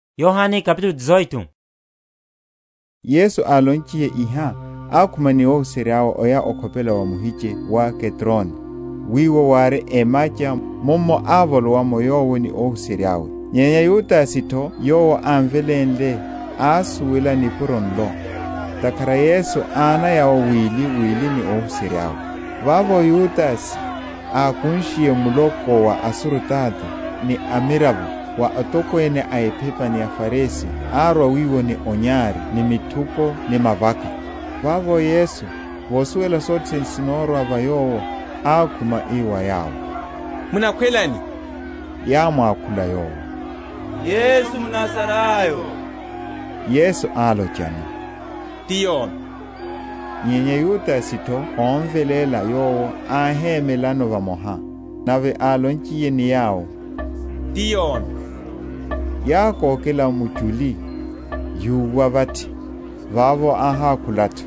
Ophariwa wa Yesu. Yesu álonchiye iha, ákhuma ni óhuserya’we, oya okhopela wa muhiche wa Kedroni, wiwo wári emacha, mummo ávolowa’mo Yowo ni óhuserya’we. Nyenya Yudase’tho yowo ámvelénle, ásuwela nipuro nlo; ntakhara Yesu ánaya’wo wiliwili ni óhuserya’we. Vavo Yudase, ákunshiye muloko wa asurutato, ni amiravo wa atokwene a ephepa ni aFarisi, árwa wiwo ni onyari ni mithuko ni mavaka. Vavo Yesu, vosuwela sothe sene sinorwa va Yowo, ákhuma, ii wa yawo, Munakhwela ani? Yámwakhula Yowo, Yesu mNazarayo. Yesu álochano, Ti yomi. Nyenya Yudase’tho ómveléla Yowo, áhemelano vamoha. Nave álonchiye ni yawo, Ti yomi, yákokela muchuli, yúwa vathi. Vavo áhákoha’tho,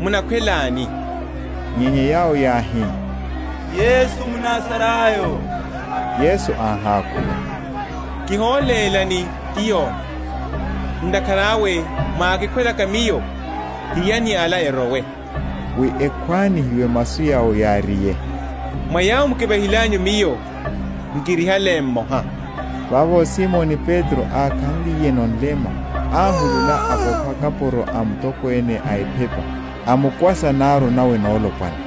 Munakhwela ani? nyenya yawo yáhi, Yesu mNazarayo. Yesu áhákhula, Kiholélani, Ti yomi: ntakhara awe mwákikhwelaka Miyo, hiyani ala erowe: wi ekhwanihiwe masu yawo yáriye, Mwa yawo mukivahilanyu Miyo, nkirihale mmoha. Vavo Simoni Petro ákhanliyeno nlema, áhulula apopha kapuro a mutokwene a ephepa, amkwasa naru nawe nolopwana.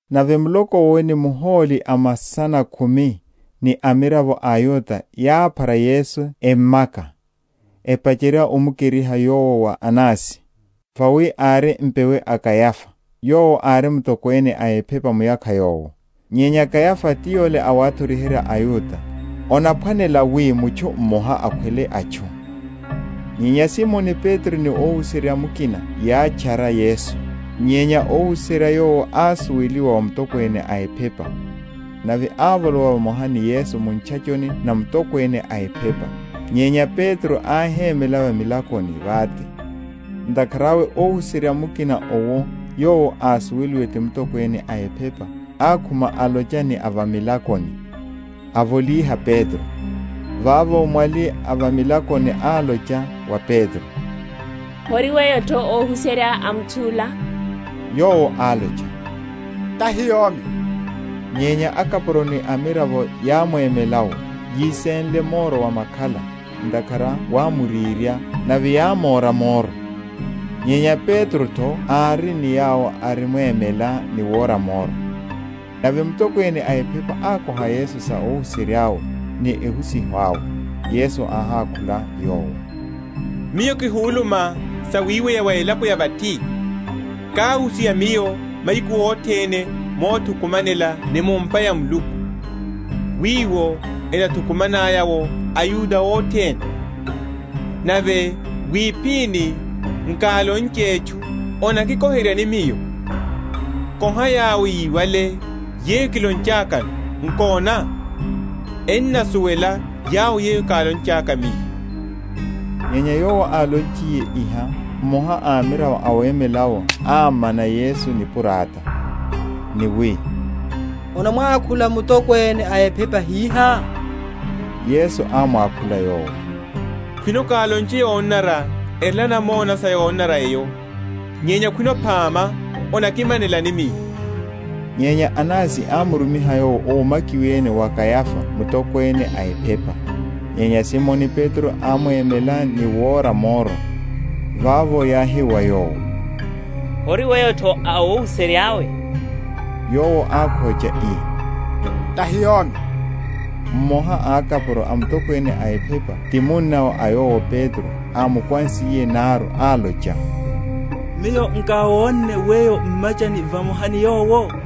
Nave muloko’wo ni muhóli a masana khumi, ni amiravo a aYuda yáphara Yesu emmaka, epacherya omukeriha Yowo wa Anasi, vawi ári mpewe a Kayafa, yowo ári mutokwene a ephepa muyakha yowo. Nyenya Kayafa ti yole awathoriherya aYuda, onaphwanela wi mutchu mmoha akhwele atchu. Nyenya Simoni Petro ni óhuserya mukina‐yátchara Yesu. Nyenya óhuserya yowo ásuweliwa wa mutokwene a ephepa, nave ávolowa vamoha ni Yesu mu ntchachoni na mutokwene a ephepa; nyenya Petro áhémela va milakoni vate. Ntakhara awe óhuserya mukina owo yowo ásuweliwe ti mutokwene a ephepa, ákhuma alocha ni avamilakoni, avolíha Petro. Vavo mwali avamilakoni álocha wa Petro, Hori weyo’tho a óhuserya a mutchu’la? Yowo álocha, Tahi yomi. Nyenya akapuro ni amiravo yámwemela’wo, yisenle moro wa makhala; ntakhara wámurirya; nave yámóra moro: nyenya Petro’tho ári ni yawo arimwemela ni wora moro. Nave mutokwene a ephepa ákoha Yesu sa óhuserya’we, ni ehusiho awe. Yesu áhákhula yowo, Miyo kihuluma sawiweya wa elapo ya vathi; káhusiha Miyo mahiku othene mothukumanela ni mu’mpa ya Muluku, wiwo enathukumanaya’wo aYuda othene; nave wiphini nkálonche etchu. Onakikoheryani Miyo? koha yawo yíwale, yeyo kilonchakano; nkona, ennasuwela yawo yeyo kálonchaka Miyo. Nyenya Yowo álonchiye iha, mmoha a amiravo awemela’wo ámmana Yesu nipurata, ni wi, Onamwakhula mutokwene a ephepa hihá? Yesu ámwakhula yowo, Khwino kálonche yonanara, erela namona sa yonanara eyo, nyenya khwino phama, onakimanelani Miyo? Nyenya Anasi ámurumiha Yowo ómakiwene wa Kayafa mutokwene a ephepa. Nyenya Simoni Petro ámwemela ni wora moro. Vavo yáhi wa yowo, Hori weyo’tho a óhuserya’we? Yowo ákhocha, ii, Tahi yomi. Mmoha a akapuro a mutokwene a ephepa ti munnawe a yole Petro ámukwansiye naru, álocha, Miyo nkáwonne weyo m’machani vamoha ni Yowo?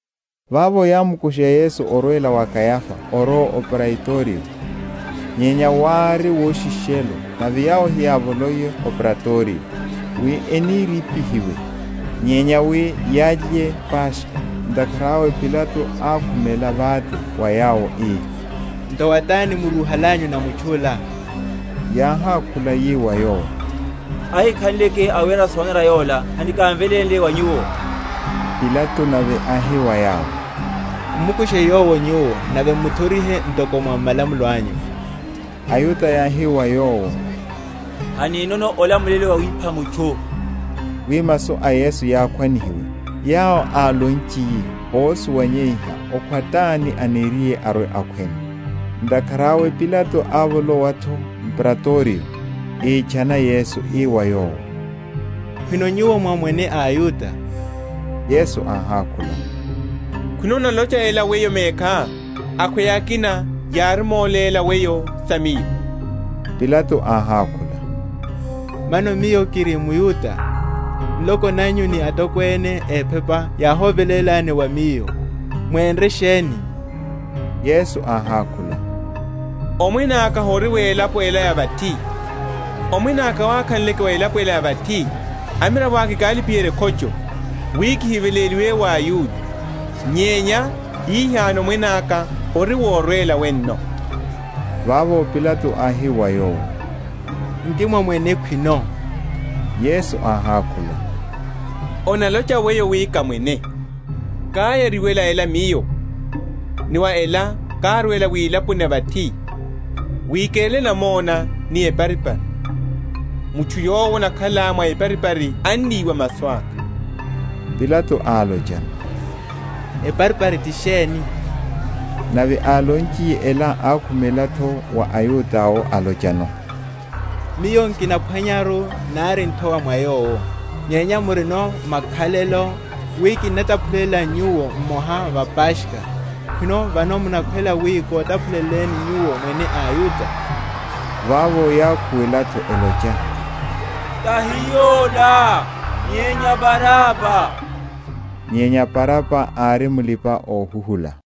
Vavo yámukusha Yesu orwela wa Kayafa orowa o Praitorio; nyenya wári woshishelo; nave yawo heyávoloiye o Praitorio, wi enirípihiwe, nyenya wi yalye Paskha. Ntakhara awe Pilato ákhumela vate wa yawo, ii, Nthowa tani murúhalanyu na mutchu’la? Yáhákhula yi wa yowo, Ahikhanleke awera sonanara yola hanikamvelénle wa nyuwo. Pilato nave áhi wa yawo, M’mukushe Yowo nyuwo, nave m’muthorihe ntoko mwa malamulo anyu. Ayuda yáhi wa yowo, Haninono olamulelo wawipha mutchu; wi masu a Yesu yakhwanihiwe, yawo álonchiye ósuwanyeiha okhwa tani aniriye arwe‐akhweno. Ntakhara awe Pilato ávolowa’tho m’Praitorio, ítchana Yesu, ii wa Yowo, Khwino Nyuwo mwá Mwene a aYuda? Yesu áhákhula, Khwino onalocha ela wa weyo mekhá, akhweya akina yárimoléla weyo sa Miyo? Pilato áhákhula, Mano miyo kiri mYuda? Nloko nanyu ni atokwene a ephepa yáhovelélani wa miyo; mwénre sheni? Yesu áhákhula, Omwene aka hori wa elapo ela ya vathi, omwene aka wákhanleke wa elapo ela ya vathi, amiravo aka ekálipiherya ekhocho, wi kihiveléliwe wa aYuda; nyenya hihano omwene aka hori worwela wenno. Vavo Pilato áhi wa Yowo, Nki mwá Mwene khwino? Yesu áhákhula, Onalocha weyo wi ká Mwene. Káyariwela ela Miyo, ni wa ela kárwela wilaponi ya vathi, wi kerele namona ni eparipari. Mutchu yowo anakhala mwa eparipari anniwa masu aka. Pilato álochano, Eparipari ti sheni? Nave álonchiye ela, ákhumela’tho wa aYuda’wo, álochano, Miyo nkinaphwanyaru nari nthowa mwa Yowo. Nyenya murino makhalelo, wi kinnataphulela nyuwo mmoha va Paskha; khwino vano munakhwela wi kotaphuleleni nyuwo Mwene a aYuda? Vavo yákhuwela’tho, elocha, Tahi ola, nyenya Baraba. Nyenya Baraba ári mulipa‐ohuhula.